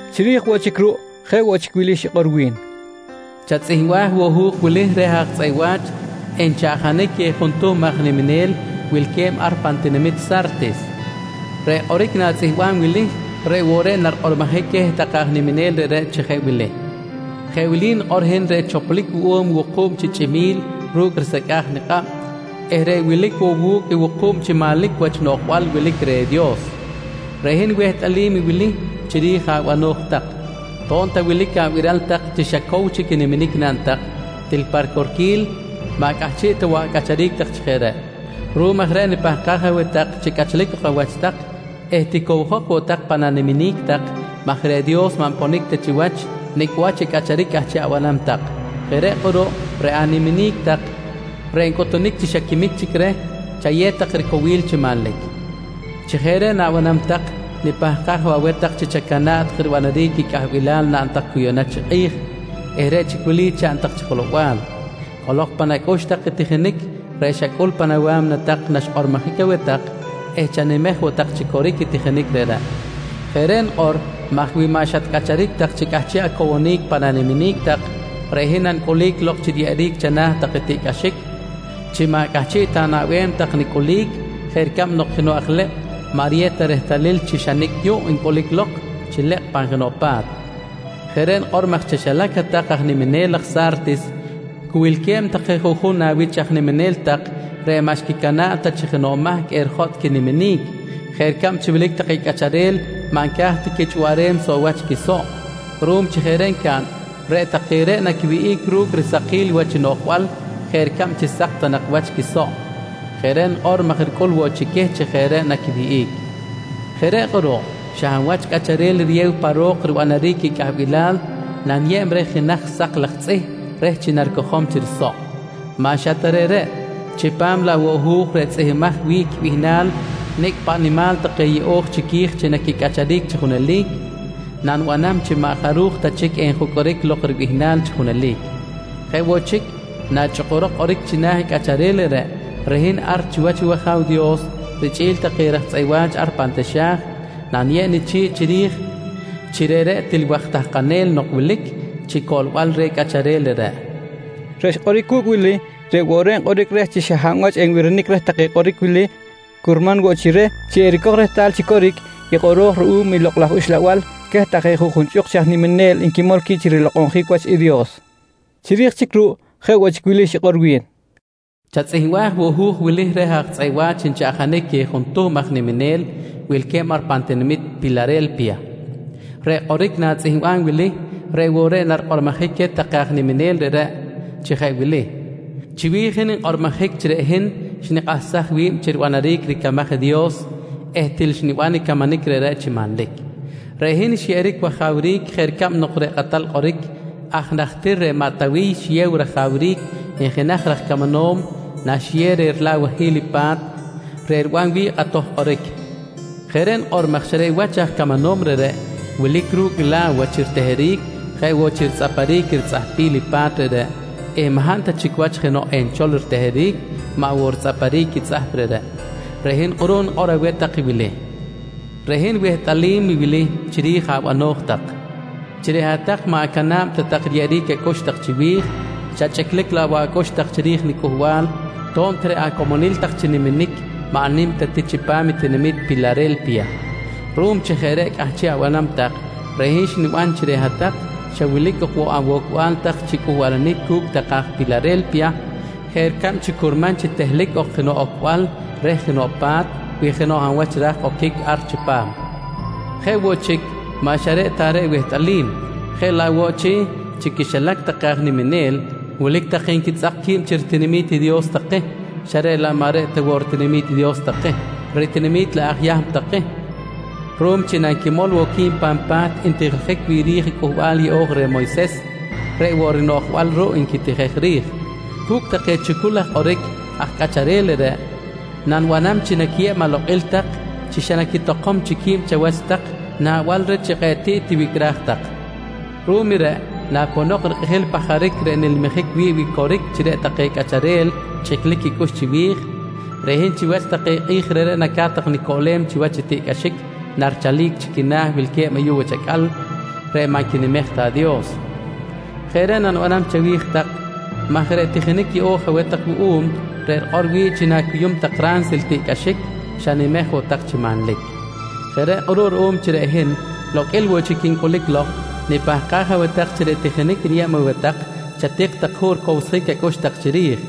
Chiri̱j woꞌ chic ruꞌ, jeꞌ woꞌ chic wili xikꞌor wi̱n: «Chatzꞌihmbaj woꞌ i hu̱j wili reh aj tzꞌeꞌ wa̱ch nchaꞌjanic queh juntuhm aj niminel wilque̱b ar pan tinamit Sa̱rtis. Reꞌ kꞌoric na̱tzꞌihmbam wili reꞌ woꞌ reꞌ narikꞌormojic queh take aj niminel reꞌreꞌ chi jeꞌ wili: ‹Jeꞌ wili nikꞌor i hin reꞌ choplic wuꞌum i wuku̱b chi chꞌimi̱l ru̱cꞌ risecꞌa̱j nikꞌab eh reꞌ wilic woꞌ wu̱cꞌ i wuku̱b chi manlic wach noꞌjbal wilic reh i Dios. Reꞌ hin wehtꞌalim i wili chiri̱j abano̱j tak: To̱b ta wilic abiral tak chi xa cow chic i niminic naꞌn tak, til pa ricorquil maꞌ cꞌahchiꞌ ta woꞌ acꞌacharic tak chi jeꞌ reꞌ. Ruꞌum aj reꞌ nipahkaj aweh tak chi cꞌachlic ok awach tak eh ticowjok woꞌ tak pan animinic tak maj reꞌ Dios maꞌ nponic ta chiwach nicꞌ wach i cꞌacharic cꞌahchiꞌ abanam tak. Jeꞌ reꞌ kꞌuruꞌ reꞌ animinic tak reꞌ ncꞌutunic chi xa quimic chic reh, chayew tak ricowil chi manlic. Chi jeꞌ reꞌ na̱banam tak, nipahkaj woꞌ aweh tak chi chacana̱ꞌ tak ribanaric i cꞌahbilal naꞌn tak cu yuꞌna chi kꞌi̱j eh reꞌ chic i wili chaꞌn tak chi jelow-bal: Cꞌolok pan acꞌux tak i tijinic reꞌ xacꞌul tak pan awa̱mna tak naxkꞌormojic aweh tak eh chanimej woꞌ tak chi coric i tijinic reꞌreꞌ. Jeꞌ reꞌ nikꞌor maj wi maꞌ xatcꞌacharic tak chi cꞌahchiꞌ acowonic pan animinic tak, reꞌ hin nanicꞌulic lok chi riyeꞌeric chana̱ tak i tiꞌcꞌaxic chi maꞌ cꞌahchiꞌ ta anaꞌbem tak nicꞌulic jeꞌ ricab nok jenoꞌ aj lekꞌ maꞌ riyew ta rehtalil chi xa nicꞌ yuꞌ ncꞌulic lok chi lekꞌ pan jenoꞌ pa̱t. Jeꞌ reꞌ nikꞌor maj chaxilac hat-tak aj niminel aj Sa̱rtis cu wilque̱b take juꞌjun awich aj niminel tak reꞌ maꞌ xquicana̱ꞌ ta chi jenoꞌ mahc erijotꞌ quiniminic jeꞌ ricab chi wilic take cꞌacharel maꞌ nca̱j ta quichꞌuwaꞌrem soꞌ wach quisoꞌ. Ruꞌum chi jeꞌ reꞌ ncaꞌn, reꞌ take reꞌ naquiwihꞌic ru̱cꞌ risakil wach noꞌjbal jeꞌ ricab chi sak ta nak wach quisoꞌ. Jeꞌ reꞌ nikꞌor maj ricꞌul woꞌ chi queh chi jeꞌ reꞌ naquiwihꞌic. Jeꞌ reꞌ kꞌuruꞌ, xa hab wach cꞌacharel riyew pan ro̱k ribanaric i cꞌahbilal, naniyeb reh jenaj sak laj tzꞌih reh chi naricojom chi risoꞌ. Maꞌ xa ta reꞌreꞌ, chipam laꞌ woꞌ i hu̱j reꞌ tzꞌihmbimaj wi̱ꞌ quibihnal nicꞌ paꞌ nimal take yeꞌo̱j chiqui̱j chi naquicꞌacharic chi junelic, nanibanam chi maꞌ jaruj ta chic enjucꞌuric lok ribihnal chi junelic. Jeꞌ woꞌ chic, nachꞌukurok kꞌoric china̱ i cꞌacharel reꞌreꞌ, reꞌ hin ar chiwach wAja̱w Dios richꞌi̱l take raj tzꞌeꞌ wa̱ch ar pan taxa̱j, naniyeb nichi̱ꞌ chiri̱j chi reꞌreꞌ til waj tahkanel nok wilic chi coꞌlbal reh i cꞌacharel reꞌreꞌ, nqui xikꞌor wi̱n. Reꞌ xkꞌoric wu̱cꞌ wili, reꞌ woꞌ reꞌ nkꞌoric reh chi xa hab wach enbirinic reh take kꞌoric wili curman woꞌ chi reh chi ericoj rehtal chi coric i kꞌoro̱j ruꞌum i Lokꞌ laj Uxlabal queh take juꞌjun chꞌuk chi aj niminel nquimol qui̱b chi rilokꞌonjic wach i Dios. Chiri̱j chic ruꞌ, jeꞌ woꞌ chic wili xikꞌor wi̱n: «Chatzꞌihmbaj woꞌ i hu̱j wili reh aj tzꞌeꞌ wa̱ch nchaꞌjanic queh juntuhm aj niminel wilque̱b ar pan tinamit Pilare̱lpiya. Reꞌ kꞌoric na̱tzꞌihmbam wili reꞌ woꞌ reꞌ narikꞌormojic queh take aj niminel reꞌreꞌ chi jeꞌ wili: ‹Chiwi̱j hin nkꞌormojic chi reꞌ hin xnikꞌahsaj wi̱b chi ribanaric ricamaj i Dios eh til xniban i camanic reꞌreꞌ chi manlic. Reꞌ hin xyeꞌeric wajawric jeꞌ ricab nok reꞌ kꞌatal kꞌoric aj najtir reꞌ maꞌ Tawiy xiyew rajawric i jenaj raj camanom naxiyew reh rila̱wahil i pa̱t reꞌ riban wi̱ꞌ kꞌatoj kꞌoric. Jeꞌ reꞌ nikꞌor maj xa reꞌ aj wach i camanom reꞌreꞌ wilic ru̱cꞌ i la̱wa chi riteheric jeꞌ woꞌ chi ritzꞌaparic ritzꞌahpil i pa̱t reꞌreꞌ eh maꞌ hab ta chic wach jenoꞌ enchol riteheric, maꞌ woꞌ ritzꞌaparic i tzꞌahp reꞌreꞌ. Reꞌ hin kꞌuruꞌ nikꞌor aweh tak i wili: Reꞌ hin wehtꞌalim i wili chiri̱j abano̱j tak: Chi reꞌ hat-tak maꞌ acana̱b ta tak riyeꞌeric acꞌux tak chiwi̱j, xa chꞌiclic laꞌ woꞌ acꞌux tak chiri̱j niCꞌuhbal, to̱b ta reꞌ acomonil tak chi niminic maꞌ nim ta ti chipam i tinamit Pilare̱lpiya. Ruꞌum chi jeꞌ reꞌ cꞌahchiꞌ abanam tak, reꞌ hin xniban chi reꞌ hat-tak xa wilic ok woꞌ awocbal tak chi cꞌuhbalanic cu̱cꞌ take aj Pilare̱lpiya, jeꞌ ricab curman chi tehlic ok jenoꞌ ocbal reh jenoꞌ pa̱t wi jenoꞌ hab wach ra̱j oquic ar chipam. Jeꞌ woꞌ chic, maꞌ xa reꞌ ta reꞌ wehtꞌalim, jeꞌ laꞌ woꞌ chi, chi quixilac take aj niminel wilic take nquitzꞌak qui̱b chi ritinami̱t i Dios take xa reꞌ laꞌ maꞌ reꞌ ta woꞌ ritinami̱t i Dios take, ritinami̱t laꞌ aj Yahm take ruꞌum chi nanquimol woꞌ qui̱b pan pa̱t ntijiljic wi̱ꞌ ri̱j i Cꞌuhbal Yeꞌo̱j reh Moyses, reꞌ woꞌ rinoꞌjbal ruꞌ nquitijej ri̱j. Cu̱cꞌ take chucul laj kꞌoric aj cꞌacharel reꞌreꞌ, nanibanam chi naquiyeb alokꞌil tak chi xa naquitokom chic qui̱b chawach tak naꞌbal reh chi kꞌe̱ꞌ tiꞌ tiwicꞌraj tak. Ruꞌum i reꞌ naponok rikꞌijil i pajaric reꞌ nilmijic wi̱ꞌ wi coric chi reꞌ take cꞌacharel chꞌiclic quicꞌux chiwi̱j, reꞌ hin chiwach take kꞌi̱j reꞌreꞌ naca̱t tak nicoꞌlem chiwach i tiꞌcꞌaxic narichalic chi quina̱ wilque̱b ayuꞌ wach acꞌal reꞌ maꞌ nquinimej ta i Dios. Jeꞌ reꞌ nanibanam chawi̱j tak maj reꞌ tijinic yeꞌo̱j aweh tak wuꞌum reꞌ rikꞌor wi̱ꞌ chi na̱cuyum tak ransil i tiꞌcꞌaxic, xanimej woꞌ tak chi manlic. ‹Jeꞌ reꞌ kꞌuruꞌ ruꞌum chi reꞌ hin loqꞌuil woꞌ chic quincꞌulic lok, nipahkaj aweh tak chi reꞌ tijinic niyeb aweh tak chatik tak juꞌ ricowsjic acꞌux tak chiri̱j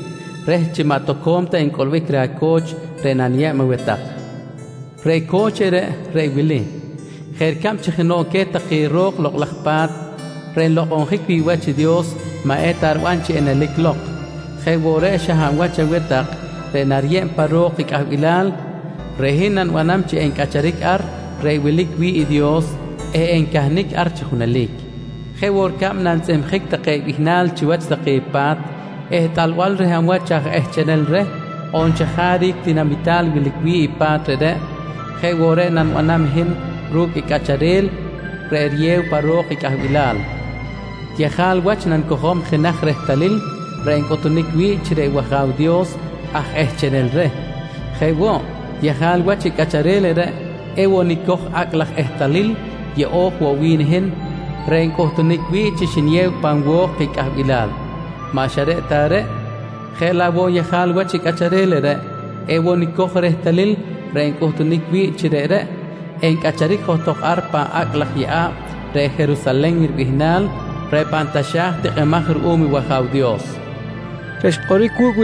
reh chi maꞌ toco̱m ta encꞌulbic reh aco̱ch reꞌ naniyeb aweh tak. Reꞌ co̱ch reꞌreꞌ, reꞌ i wili: Jeꞌ ricab chi jenoꞌ queh take ro̱k Lokꞌ laj Pa̱t reꞌ nlokꞌonjic wi̱ꞌ wach i Dios maꞌ eta riban chi enelic lok jeꞌ woꞌ reꞌ xa hab wach aweh tak reꞌ nariyeb pa ro̱k i cꞌahbilal, reꞌ hin nanibanam chi encꞌacharic ar reꞌ wilic wi̱ꞌ i Dios eh encahnic ar chi junelic. Jeꞌ woꞌ ricab nantzꞌihmjic take bihnal chiwach take pa̱t ehtꞌalbal reh hab wach aj ehchenel reh on chajaric tinamital wilic wi̱ꞌ i pa̱t reꞌreꞌ, jeꞌ woꞌ reꞌ nanibanam hin ru̱cꞌ i cꞌacharel reꞌ riyew pa ro̱k i cꞌahbilal. Yejal wach nanicojom jenaj rehtalil reꞌ encꞌutunic wi̱ꞌ chi reꞌ wAja̱w Dios aj ehchenel reh. Jeꞌ woꞌ, yejal wach i cꞌacharel reꞌreꞌ ewoꞌ nicoj i acꞌ laj ehtalil yeꞌo̱j woꞌ wi̱n i hin reꞌ ncꞌutunic wi̱ꞌ chi xniyew pan wo̱k i cꞌahbilal. Maꞌ xa reꞌ ta reꞌ, jeꞌ laꞌ woꞌ yejal wach i cꞌacharel reꞌreꞌ, ewoꞌ nicoj i rehtalil reꞌ encꞌutunic wi̱ꞌ chi reꞌreꞌ encꞌacharic johtok ar pan “Acꞌ laj yeꞌa̱b reꞌ Jerusalen” ribihnal reꞌ pan taxa̱j tikꞌimaj ruꞌum i wAja̱w Dios, nqui xkꞌoꞌronic wi̱n.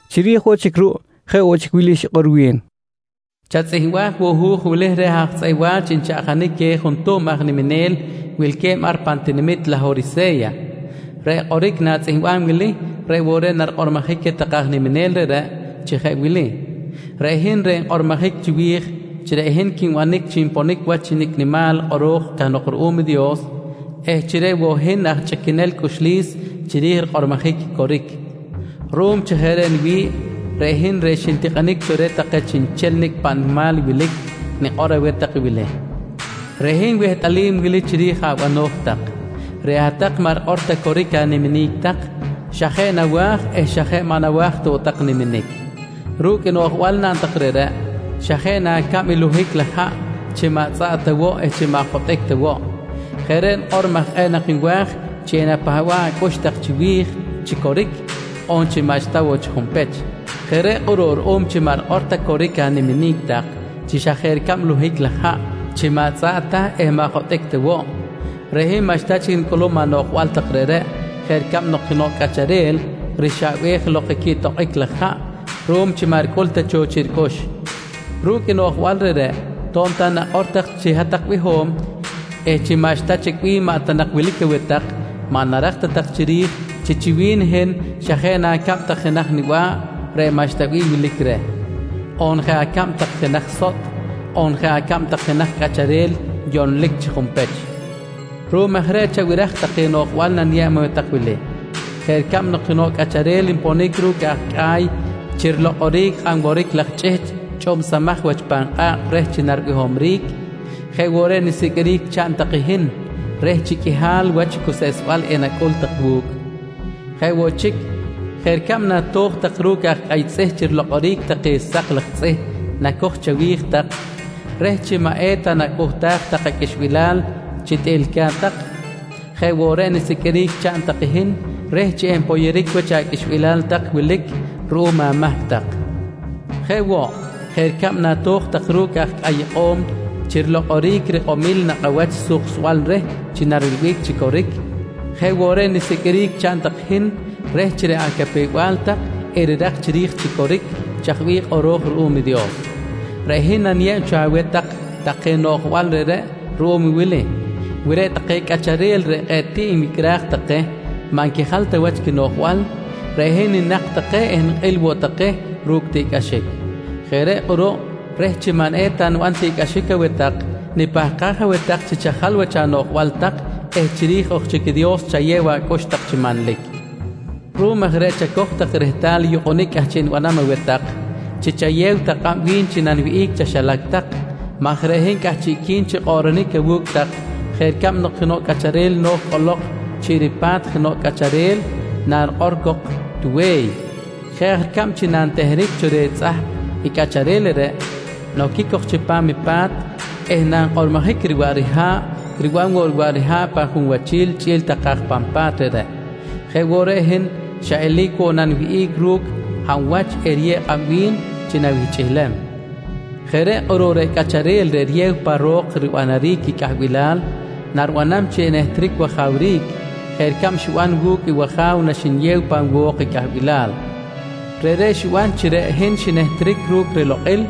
Chiri̱j woꞌ chic ruꞌ, jeꞌ woꞌ chic wili xikꞌor wi̱n: «Chatzꞌihmbaj woꞌ i hu̱j wili reh aj tzꞌeꞌ wa̱ch nchaꞌjanic queh juntuhm aj niminel wilque̱b ar pan tinamit Lahorise̱ya. Reꞌ kꞌoric na̱tzꞌihmbam wili reꞌ woꞌ reꞌ narikꞌormojic queh take aj niminel reꞌreꞌ chi jeꞌ wili: ‹Reꞌ hin reꞌ nkꞌormojic chiwi̱j chi reꞌ hin quinbanic chi nponic wach nicꞌ nimal kꞌoro̱j cahnok ruꞌum i Dios eh chi reꞌ woꞌ hin aj chꞌiquenel cꞌuxlis chiri̱j rikꞌormojic i coric. Ruꞌum chi jeꞌ reꞌ niwi̱ꞌ, reꞌ hin reꞌ xintikꞌinic cho reh take chiꞌnchel nicꞌ paꞌ nimal wilic, nikꞌor aweh tak wili: Reꞌ hin wehtꞌalim wili chiri̱j abano̱j tak: Reꞌ hat-tak maꞌ rikꞌor ta coric animinic tak xa jeꞌ nawa̱j eh xa jeꞌ maꞌ nawa̱j ta woꞌ tak niminic. Ru̱cꞌ i noꞌjbal naꞌn tak reꞌreꞌ xa jeꞌ na acab i luhic laj haꞌ chi maꞌ tzꞌaꞌ ta woꞌ eh maꞌ jotꞌic ta woꞌ. Jeꞌ reꞌ nikꞌor maj kꞌe̱ꞌ nak nwa̱j chi enapahba̱ꞌ acꞌux tak chiwi̱j chi coric on maꞌxta woꞌ chi junpech. Jeꞌ reꞌ kꞌuruꞌ ruꞌum chi maꞌ rikꞌor ta chic coric animinic tak chi xa jeꞌ ricab i luhic laj haꞌ chi maꞌ tzꞌaꞌ ta eh maꞌ jotꞌic ta woꞌ, reꞌ hin maꞌxta chic nicꞌulum anoꞌjbal tak reꞌreꞌ jeꞌ ricab nok jenoꞌ cꞌacharel rixaꞌbej lok i quiꞌtokꞌic laj haꞌ ruꞌum chi maꞌ ricꞌul ta cho chiꞌ ricꞌux. Ru̱cꞌ i noꞌjbal reꞌreꞌ to̱b ta nakꞌor tak chi hat-tak biho̱m eh chi maꞌxta chic bih maꞌ ta nak wilic aweh tak, maꞌ narak ta tak chiri̱j chi, chi wi̱n i hin xa jeꞌ na acab tak jenaj niba̱ꞌ reꞌ maꞌxta bih wilic reh, on jeꞌ acab tak jenaj sotꞌ, on jeꞌ acab tak jenaj cꞌacharel yonlic chi junpech. Ruꞌum aj reꞌ chabiraj take noꞌjbal naniyeb aweh tak wili: Jeꞌ ricab nok jenoꞌ cꞌacharel nponic ru̱cꞌ aj cꞌa̱y chi rilokꞌoric i kꞌan woric laj chꞌihchꞌ chꞌubsamaj wach pan kꞌa̱kꞌ reh chi naribihomric, jeꞌ woꞌ reꞌ nisiqꞌuiric chaꞌn tak i hin reh chi qꞌuihal wach cuseꞌsbal enacꞌul tak wu̱cꞌ. Jeꞌ woꞌ chic, jeꞌ ricab nato̱j tak ru̱cꞌ aj cꞌa̱y tzꞌih chi rilokꞌoric take sak laj tzꞌih nacoj chawi̱j tak reh chi maꞌ eta nacꞌuhtaj tak aqꞌuixbilal chi tꞌiꞌlica̱t tak, jeꞌ woꞌ reꞌ nisiqꞌuiric chaꞌn tak i hin reh chi enpoyoric wach aqꞌuixbilal tak wilic ruꞌum amahc tak. Jeꞌ woꞌ, jeꞌ ricab nato̱j tak ru̱cꞌ aj cꞌa̱y ikꞌo̱m chi rilokꞌoric rikꞌomil nakꞌ awach suksbal reh chi narilbic chi coric, jeꞌ woꞌ reꞌ nisiqꞌuiric chaꞌn tak i hin reh chi reꞌ acapew-bal tak erirak chiri̱j chi coric chaj bih kꞌoro̱j ruꞌum i Dios. Reꞌ hin naniyeb cho aweh tak take noꞌjbal reꞌreꞌ ruꞌum i wili: Wi reꞌ take cꞌacharel reꞌ kꞌe̱ꞌ tiꞌ nwicꞌraj take maꞌ nquijal ta wach quinoꞌjbal, reꞌ hin ninak take eh nikꞌil woꞌ take ru̱cꞌ tiꞌcꞌaxic. Jeꞌ reꞌ kꞌuruꞌ reh chi maꞌ eta niban tiꞌcꞌaxic aweh tak nipahkaj aweh tak chi chajal wach anoꞌjbal tak eh chiri̱j ok chic i Dios chayew acꞌux tak chi manlic. Ruꞌum aj reꞌ chacoj tak rehtal i yukꞌunic cꞌahchiꞌ nibanam aweh tak chi chayew tak kꞌab wi̱n chi naniwihꞌic chaxilac tak maj reꞌ hin cꞌahchiꞌqui̱n chi kꞌoꞌronic awu̱cꞌ tak jeꞌ ricab nok jenoꞌ cꞌacharel no̱j cꞌolok chiꞌ ripa̱t jenoꞌ cꞌacharel narikꞌor cok tuwe̱y. Jeꞌ aj ricab chi nanteheric cho reh i tzꞌahp i cꞌacharel reꞌreꞌ, noquic cok chipam i pa̱t eh nankꞌormojic riwaꞌ riha̱ꞌ, riban woꞌ riwaꞌ riha̱ꞌ pan junwachil chꞌi̱l take aj pan pa̱t reꞌreꞌ, jeꞌ woꞌ reꞌ i hin, xa eli̱c woꞌ naniwihꞌic ru̱cꞌ i hab wach eriyew kꞌab wi̱n chi nawihchꞌilem. Jeꞌ reꞌ kꞌuruꞌ reꞌ cꞌacharel reꞌ riyew pa ro̱k ribanaric i cꞌahbilal, nanibanam chi enehtric wajawric jeꞌ ricab xiban wu̱cꞌ i wAja̱w naxniyew pan wo̱k i cꞌahbilal. Reꞌreꞌ xiban chi reꞌ hin xinehtric ru̱cꞌ rilokꞌil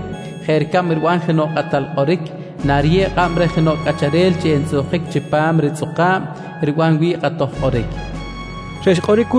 jeꞌ ricab riban jenoꞌ kꞌatal kꞌoric nariyew kꞌab reh jenoꞌ cꞌacharel chi entzꞌuhkic chipam ritzꞌukꞌa̱b riban wi̱ꞌ kꞌatoj kꞌoric, nqui xikꞌor wi̱n.